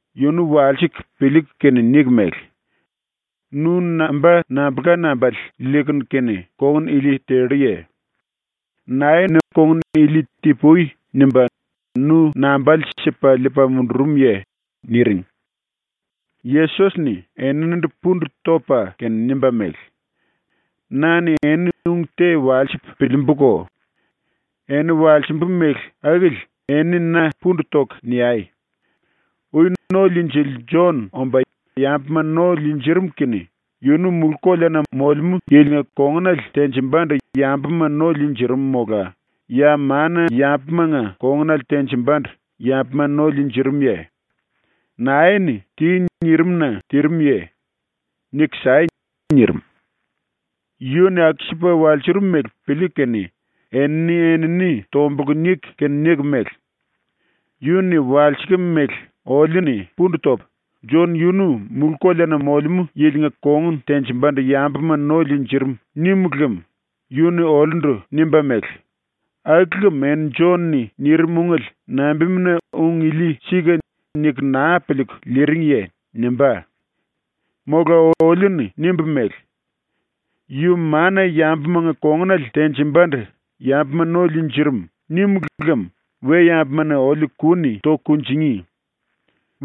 yunu walsiku piliiku kene niku mele: “Nu namba nambulka nambale liikunu kene kongun ili telluye? Nae-ni kongun ili “Ti-pui.” nimba nu nambale sipa liipa mundurumye?” niring. Yesos-ni eninindu pundu topa kene nimba mele: “Na-ni eni ung te walsipu piliimbuko. Eni walsimbu mele akili eni na pundu toku niai. Ui ⸤No-Liinjili⸥ Jon omba yambuma no liinjirim kene yunu mulú-koleana ⸤molemú yilinga⸥ kongunale tenjimbandu yambuma no liinjirim mola ya mana-yambumanga kongunale tenjimbandu yambuma no liinjirimuye? ⸤Nae-ni “Ti.” nirim-na tirimuye? Niku sai.⸥” nirim. ⸤Yu-ni aku-sipa walsurum mele piliiku kene⸥ eni-enini tombulku niku kene niku mele: “Yu-ni walsikim mele oliu-ni pundu topu, “⸤Jon⸥ yunu mulú-koleana ⸤molemú yilinga kongun tenjimbandu yambuma no liinjirim⸥.” nímulu lem yu-ni oliundu nimba mele: “Aku lem eni Jon-ni nirim ungele nambimuna ‘Ung ili sika.’ niku naa piliiku liiringiye?” nimbá. Mola oliu-ni nimbu mele: “Yu mana-yambumanga ⸤kongunale tenjimbandu yambuma no liinjirim⸥.” nímulu lem we-yambuma-ni oliu ku-ni toku kunjingí.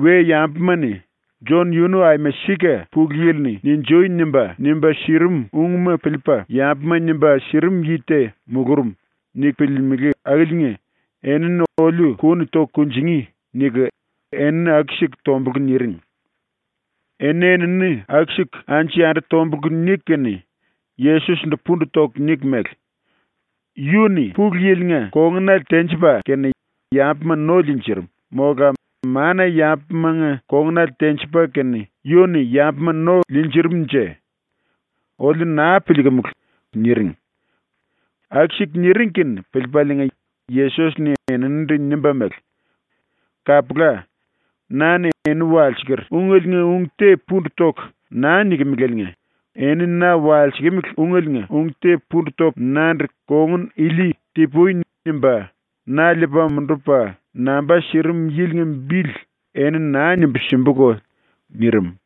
We-yambuma-ni ‘Jon yunu aima sika Pulu Yili-ni “Ninjui!” nimba, nimba sirimu ungma piliipa yambuma nimba sirim yi te mulurum.’ niku piliilimili akiliinga enini oliu ku-ni toku kunjingí.” niku enini aku-siku tombulku niring. ⸤Eni-enini aku-siku anju-yandu tombulku niku kene⸥ Yesos-ndu pundu toku niku mele: “Yu-ni Pulu Yili-nga kongunale tenjipa kene yambuma no liinjirim, mola mana-yambumanga kongunale tenjipa kene yu-ni yambuma no liinjirim-nje. Oliu naa piliikumulu.” niring. Aku-siku niring kene piliipaliinga Yesos-ni eninindu nimba mele: “Kapula. ⸤Na-ni eni walsiker ungeliinga ung te pundu toku naa nikimilieliinga⸥ eni na walsikimili ungeliinga ung te pundu topu nandu kongun ili ‘Ti-pui.’ nimba na liipa mundupa namba sirim yilinga bili eni naa nimbu simbuko.” nirim.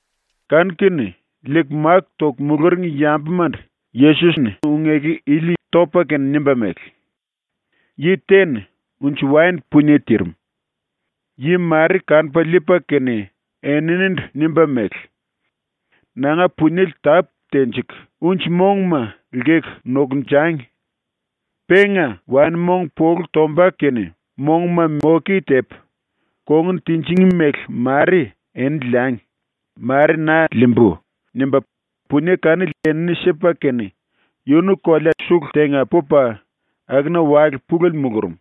Kanu-kene liiku máku toku muluring yambumandu Yesos-ni ung-eku ili topa kene nimba mele: “Yi te-ni unji-waen punie tirim. Yi mare kanupa liipa kene eninindu nimba mele: “Nanga puniele tápu tenjiku unji-monguma lkeku nokunjangi. Penga waen-mong polu tomba kene monguma moke tepu, kongun tinjingí mele mare eni liangi, mare na liimbú.” nimba punie kanili enini sipa kene yunu kolea ⸤sulu⸥ tenga pupa akuna wale pulele mulurum.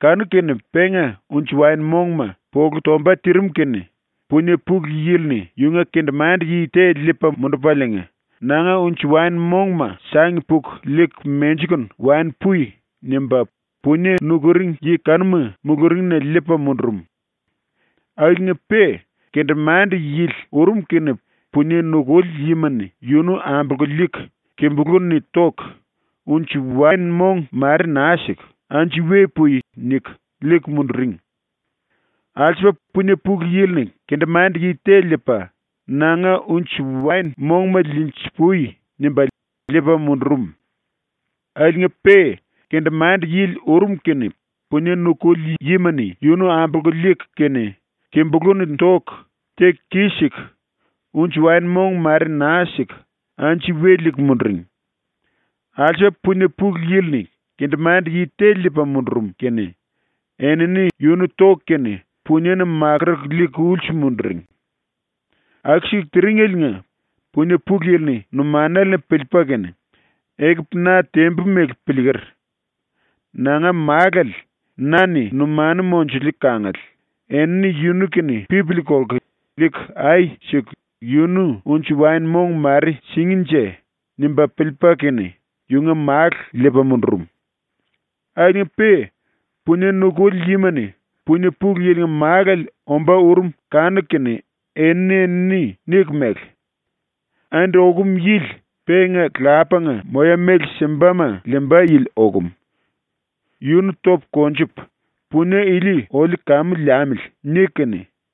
Kanu-kene penga unji-waen-mongma polu tomba tirim kene punie pulu yili-ni yunga kendemande-yi te liipa mundupaliinga “Nanga unji-waen-mongma sangi puku liiku menjikunu wani pui.” nimba punie nukuring yi kanuma muluringna liipa mundurum. Akiliinga-pe kendemande-yili ⸤urum kene⸥ punie nukuli yima-ni yunu ambolku liiku kimbulú-ni toku, unji-waen-mong mare naa siku, “Anju we pui!” niku liiku munduring. Alsupa punie pulu yili-ni kendemande-yi te liipa ⸤“Nanga unji-waen-mongma liinji-pui.” nimba liipa⸥ mundurum. Akiliinga-pe kendemande-yili ⸤urum kene⸥ punie nukuli yima-ni yunu ambolku liiku kene kimbulú-ni toku, teku kis-siku, unji-waen-mong mare naa siku anju we liiku munduring. Alsupa punie pulu yili-ni kendemande-yi te liipa mundurum kene enini yunu toku kene puniena makuruku liiku ulsu munduring. Aku-siku tiringeliinga punie pulu yili-ni ⸤numanale-ni piliipa kene⸥ ‘Ekupu na tembu mele piliiker. Nanga málale, na-ni numanu monjuliu kangale, enini yunu-kene pipili kolku liiku ai siku yunu unji-waen-mong mare singínje.’ nimba piliipa kene ⸤yunga málu liipa mundurum⸥. Akiliinga-pe punie nukuli yima-ni punie pulu yilinga málale ombá urum kanuku kene eni-enini niku mele: “Andi okum yili penga lapanga moya-méle simbama liimba yili okum. Yunu topu konjupu, punie ili oliu kamu liamili.” niku kene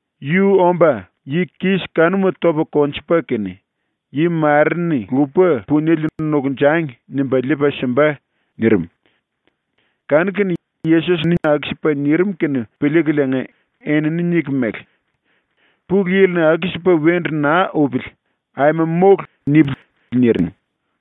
Yu omba yi kis kanuma topa konjupa kene ‘Yi mare-ni lupa puniele nokunjangi.’ nimba liipa simba.” nirim. Kanu-kene Yesos-ni aku-sipa nirim kene piliikuliinga enini niku mele: “Pulu Yili-ni ‘Aku-sipa wendu naa upili, aima mólu!’ nipili.” niring.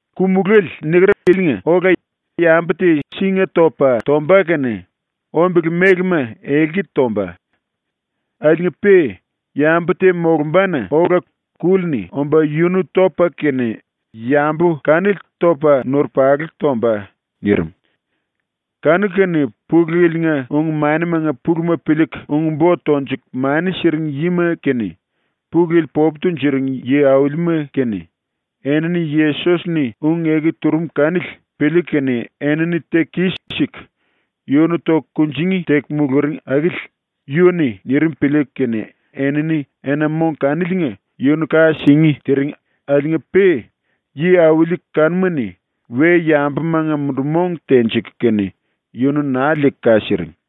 Ku-mulále ⸤niker⸥ ilinga ola yambu te singa-topa tomba kene ombele mélema elki tomba. Akiliinga-pe yambu te molumbana ola kúli-ni omba yunu topa kene yambu kanili topa nurupalu tomba.” nirim. Kanu-kene Pulu Yili-nga ung-manimanga puluma piliiku ung-bo tonjuku mani siring yima kene, Pulu Yili popu tunjuring yi-aulima kene, enini Yesos-ni ung-eku turum kanili piliiku kene enini teku kis-siku yunu toku kunjingí teku muluring akili yu-ni nirim piliiku kene enini ena-mong kaniliinga yunu ka singí tiring akiliinga-pe yi-auli kanuma-ni we-yambumanga mundu-mong tenjiku kene yunu naa liiku ka siring.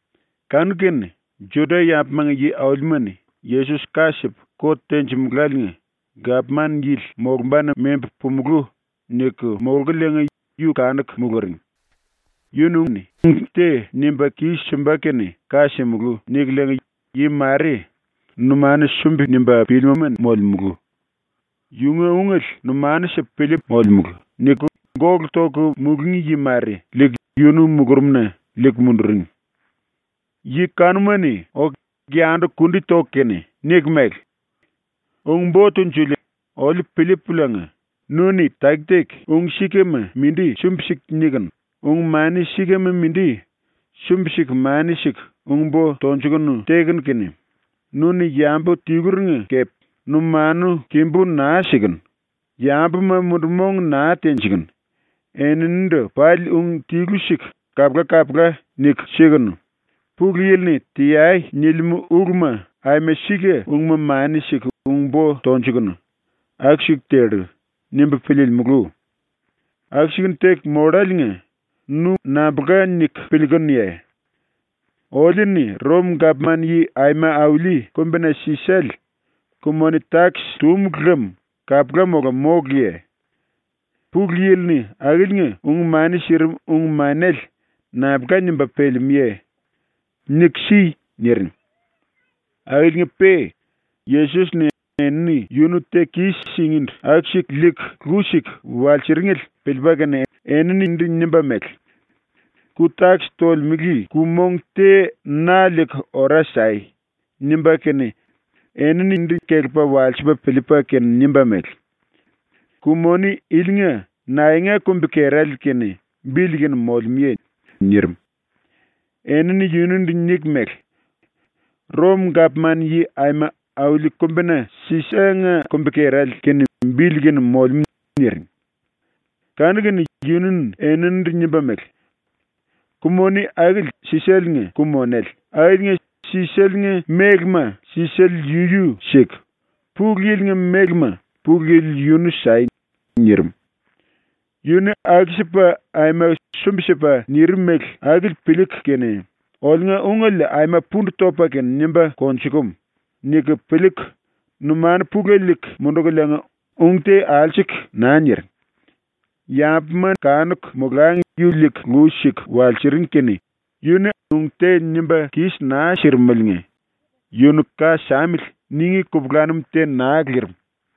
Kanu-kene ⸤Juda-yambumanga yi-aulima-ni⸥ ‘Yesos ka sipu ⸤kot tenjimuláliinga⸥ gapman yili molumbana membu pumulú.’ niku molkuliinga yu kanuku muluring. ‘Yunu-ni ung te nimba kis-simba kene ka simulú.’ nikuliinga yi mare, ‘Numanu sumbi-nimba pílima molemulu. Yunga ungele numanu sipu piliipu molemulu.’ niku gólu toku mulungí yi mare, liiku yunu mulurumna liiku munduring. Yi kanuma-ni oku yundu ⸤kundi toku kene⸥ niku mele: “Ung-Bo Tunjuliele, oliu piliipuliinga, ‘Nu-ni taki-taki ung-sikama mindi sumbi-siku nikunu, ung-mani sikama mindi sumbi-siku mani siku ung-bo tonjukunu tekunu kene, nu-ni yambu tiluringa kepe numanu kimbú naa sikunu, yambuma mundu-mong naa tenjikunu, eninindu pali ung tilu-siku kapula-kapula niku sikunu, Pulu Yili-ni “Teai.” nilimú uluma aima sika ungma mani siku ung-bo tonjukunu, aku-siku tellu.’ nimbu piliilimulu. ⸤Aku-sikunu teku molláliinga nu nambulka niku piliikunuye?⸥ Oliu-ni Rom-Gapman-Yi Aima Auli Kumbina Sisale ku-moni-takis túmulu lem kapula mola móluye? Pulu Yili-ni akiliinga ung-mani sirim ung-manele nambulka nimba pelemúye? Niku si.” niring. Akiliinga-pe Yesos-ni enini yunu teku kis-singíndu aku-siku liiku lu siku walsiringele piliipa kene eninindu nimba mele: “⸤Ku-takis tolemele⸥ ku-mong te na liiku ora sai.” ⸤nimba kene eninindu kelepa walsipa piliipa kene nimba mele:⸥ “Ku-moni ilinga naenga kumbi-kerale kene bili kene molemúye?” nirim. Enini yunundu niku mele: “Rom-Gapman-Yi Aima Auli Kumbina Sisale-nga ⸤kumbi-kerale kene bili kene molemú⸥.” niring. Kanu-kene yu-ni eninindu nimba mele: “⸤Ku-moni akili Sisale-nga ku-monele⸥ akiliinga Sisale-nga mélema Sisale yunu siku, Pulu Yili-nga mélema Pulu Yili yunu sai.” nirim. Yu-ni aku-sipa ⸤aima sumbi-sipa⸥ nirim mele akili piliiku kene ‘Oliunga ungele aima pundu topa kene nimba konjukumu.’ niku piliiku numanu pulele liiku mundukuliinga ung te alsuku naa niring. Yambuma kanuku molangi yu liiku lu siku walsiring kene yu-ni ung te nimba kis naa sirimeliinga “Yunu ka samili.” ningí kupulanum te naa lirim.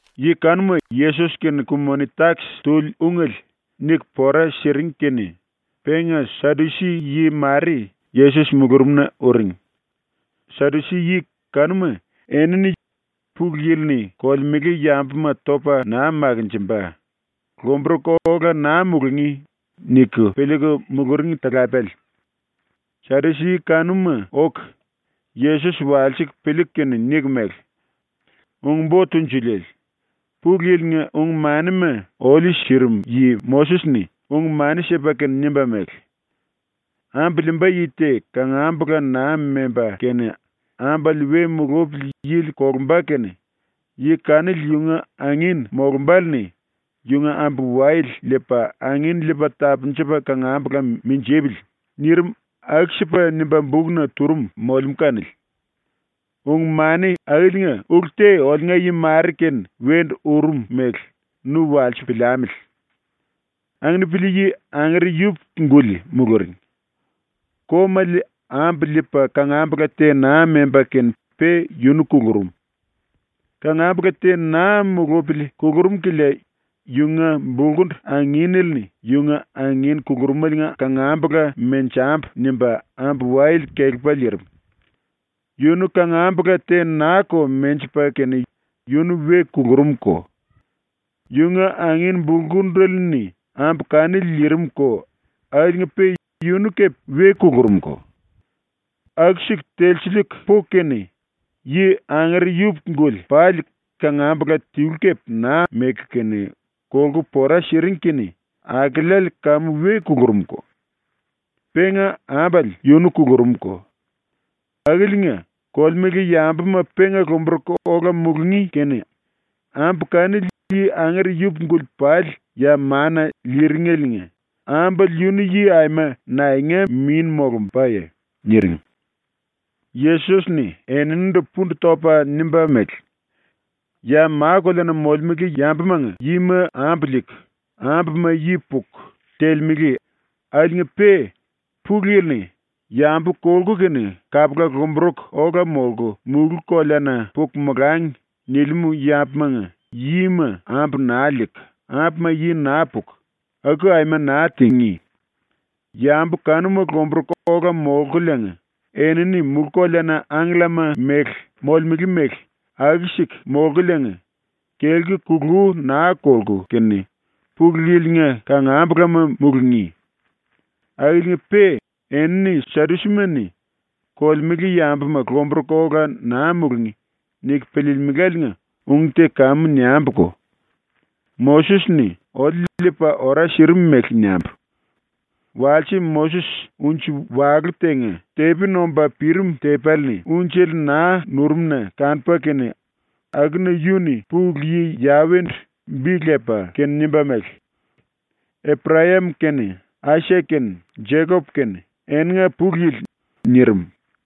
⸤Yi kanuma Yesos-kene ku-moni-takis tuli ungele niku pora siring kene⸥ penga Sadusi-yi mare Yesos mulurumna uring. Sadusi-yi kanuma enini ‘Pulu Yili-ni kolemele yambuma topa naa makinjimba, lomburuku ola naa mulungí.’ niku piliiku muluring talapele. Sadusi-yi kanuma oku Yesos walsiku piliiku kene niku mele: “Ung-Bo Tunjuliele, ⸤Pulu Yili-nga ung-manima oliu sirim yi⸥ Moses-ni ung-mani sipa kene nimba mele: “Ambu liimba yi te kangambula naa memba kene ambale we mulupili yili kolumba kene yi kanili yunga angin molumbále-ni yunga ambu-wayele liipa angin liipa tapunjupa kangambula minjipili.” nirim aku-sipa nimba bukna turum molemú kanili. ⸤Ung-mani akiliinga ulu te oliunga yi mare-kene wendu urum mele nu walsipu piliamili.⸥ “Anginipili-yi angere yupuku-guli muluring. Komale ambu liipa kangambula te naa memba kene pe yunu kulurum. ⸤Kangambula te naa mulupili kulurum kilia⸥ yunga bulkundu anginele-ni ⸤yunga angin kulurumeliinga kangambula ‘Menjambu.’ nimba⸥ ambu-wayele kelepa liirim. Yunu kangambula te naa-ko menjipa kene yunu we kulurumko. Yunga angin bulkundele-ni ambu kanili liirimko akiliinga-pe yunu kepe we kulurumko. Aku telsiliiku puku kene yi angere yupuku-guli pali kangambula tilu kepe naa meku kene kolku pora siring kene akeleale kamu we kulurumko. Penga ambale yunu kulurumko. Akiliinga, kolemele yambuma penga lomburuku ola mulungí kene ambu kanili yi angere yupuku-guli pali ya mana liiringeliinga ambale yunu yi aima naenga min molumbaye?” niring. Yesos-ni eninindu pundu topa nimba mele: “Ya ma-koleana molemele yambumanga yima ambu liiku, ambuma yi puku telemele akiliinga-pe Pulu Yili-ni ‘Yambu kolku kene kapula lomburuku ola molku mulú-koleana puku molangi.’ nilimú yambumanga yima ambu naa liiku, ambuma yi naa puku, aku aima naa tingí. Yambu kanuma lomburuku ola molkuliinga enini mulú-koleana angkellama molemele mele aku-siku molkuliinga, kelku kulú naa kolku kene Pulu Yili-nga kangambulama mulungí. Akiliinga-pe ⸤enini Sadusima-ni⸥ ‘Kolemele yambuma lomburuku ola naa mulungí.’ niku piliilimeláliinga ung te kamu niambuko. Moses-ni oliu liipa ora sirim mele niambu: Walse Moses unji walú tenga ⸤tepi nomba pirim tepéle-ni unjele naa nurum-na kanupa kene,⸥ akuna yu-ni ⸤Pulu Yi⸥ Yawe-ndu bi lepa kene nimba mele: “Eprayam kene, Aisak kene, Jekop kene eninga Pulu Yili.” nirim.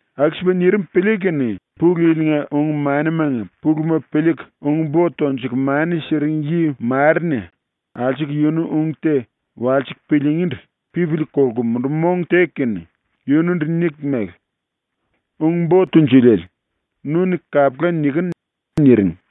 Aku-sipa nirim piliiku kene Pulu Yili-nga ung-manimanga puluma piliiku ung-bo tonjuku mani siring yi mare-ni alsuku yunu ung te walsiku piliingíndu pipili kolku mundu-mong teku kene yundu niku mele: “Ung-Bo Tunjuliele, nu-ni kapula nikinu.” niring.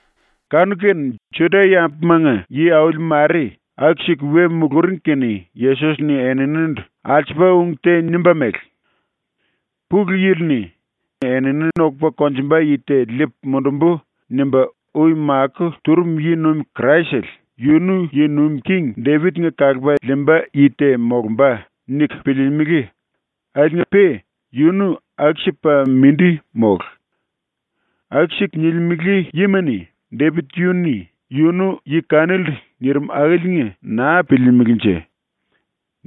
Kanu-kene ⸤Juda-yambumanga yi-auli mare aku-siku we muluring kene⸥ Yesos-ni eninindu alsupa ung te nimba mele: “‘Pulu Yili-ni “Enini nokupa konjumba yi te liipu mundumbu.” nimba ui makó turum yi-nuim Kraisele yunu ⸤yi nuim king⸥ Depit-nga kalupa liimba yi te molumba.’ niku piliilimili, ⸤akiliinga-pe yunu aku-sipa mindi mólu⸥. ⸤Aku-siku nilimele yima-ni⸥ Depit yu-ni yunu ⸤yi kanilindu nirim akili naa piliilimilinje.⸥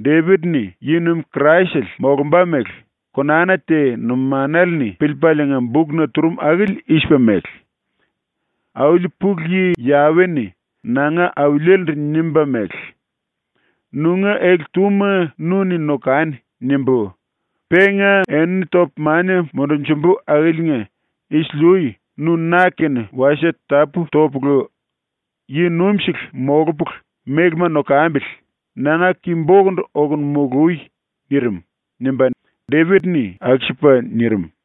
Depit-ni ⸤yi-nuim Kraisele molumba mele⸥ konana te numanale-ni piliipaliinga bukna turum akili i-sipa mele: “Auli ⸤Pulu Yi Yawe-ni⸥ nanga Auliele-ndu nimba mele: “‘Nunga ele-túma nu-ni nokani.’ nimbu, penga enini topu mania mundunjumbu akiliinga isili-ui nu ⸤na-kene wasie tapú topulu yi-nuimsele molupulu mélema nokambili⸥ nanga ki-bokundu okunu molui.” nirim.” nimba Depit-ni aku-sipa nirim.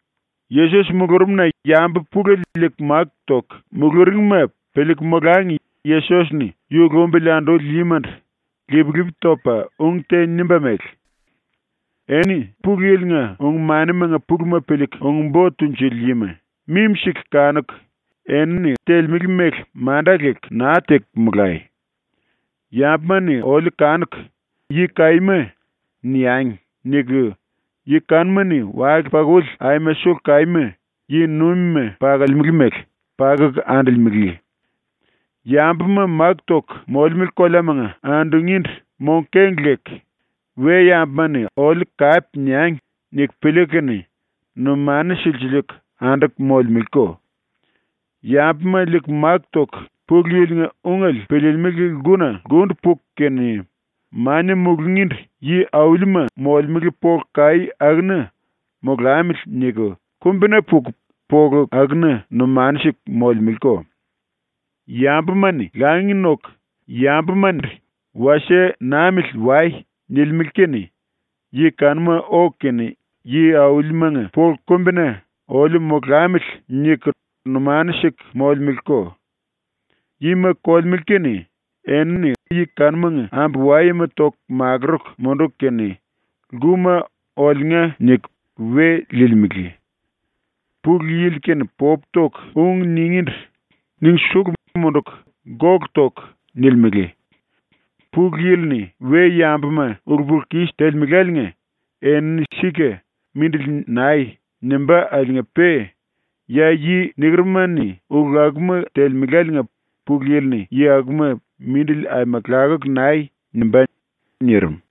Yesos mulurumna yambu pulele liiku máku toku muluringma piliiku molangi Yesos-ni yu lumbili anduli yimandu ⸤lip-lipi topa⸥ ung te nimba mele: “Eni Pulu Yili-nga ung-manimanga puluma piliiku ung-bo tunjuli yima mimi-siku kanuku ⸤enini telemele mele manda leku naa teku⸥ molai. ⸤‘Yambuma-ni oliu kanuku “Yi kaíma” niangi.’ niku⸥ yi kanuma-ni wale-pakuli aima sulu kaíma, ⸤yi-nuimima pakolemele mele,⸥ pakuku andolemele. Yambuma máku toku molemele koleamanga andungíndu mong-keng leku ‘We-yambuma-ni oliu kape niangi.’ niku piliiku kene numanu silsiliiku anduku molemeleko. Yambuma liiku máku toku Pulu Yili-nga ungele piliilimili lkuna lkundu puku kene mania mulungíndu yi-aulima molemele polu kaí akuna ‘molamili.’ niku kumbina puku polu akuna numanu siku molemeleko. Yambuma-ni langi noku yambumandu “Wasie namili wai.” nilimele kene yi kanuma oku kene yi-aulimanga polu kumbina ‘oliu molamili.’ niku numanu siku molemeleko. “Yima kolemele kene enini yi kanumanga ambu-wayema toku makuruku munduku kene lkuma ‘Oliunga’ niku we liilimele. Pulu Yili-kene popu toku ung ningíndu niku sulu munduku gólu toku nilimele. Pulu Yili-ni we-yambuma ulu-pulu-kis telemeláliinga enini sika “Mindili nai.” nimbá akiliinga-pe ya yi nikeruma-ni ulu akuma telemeláliinga Pulu Yili-ni yi akuma “Mindili aima lakuku nai.” nimbá.” nirim.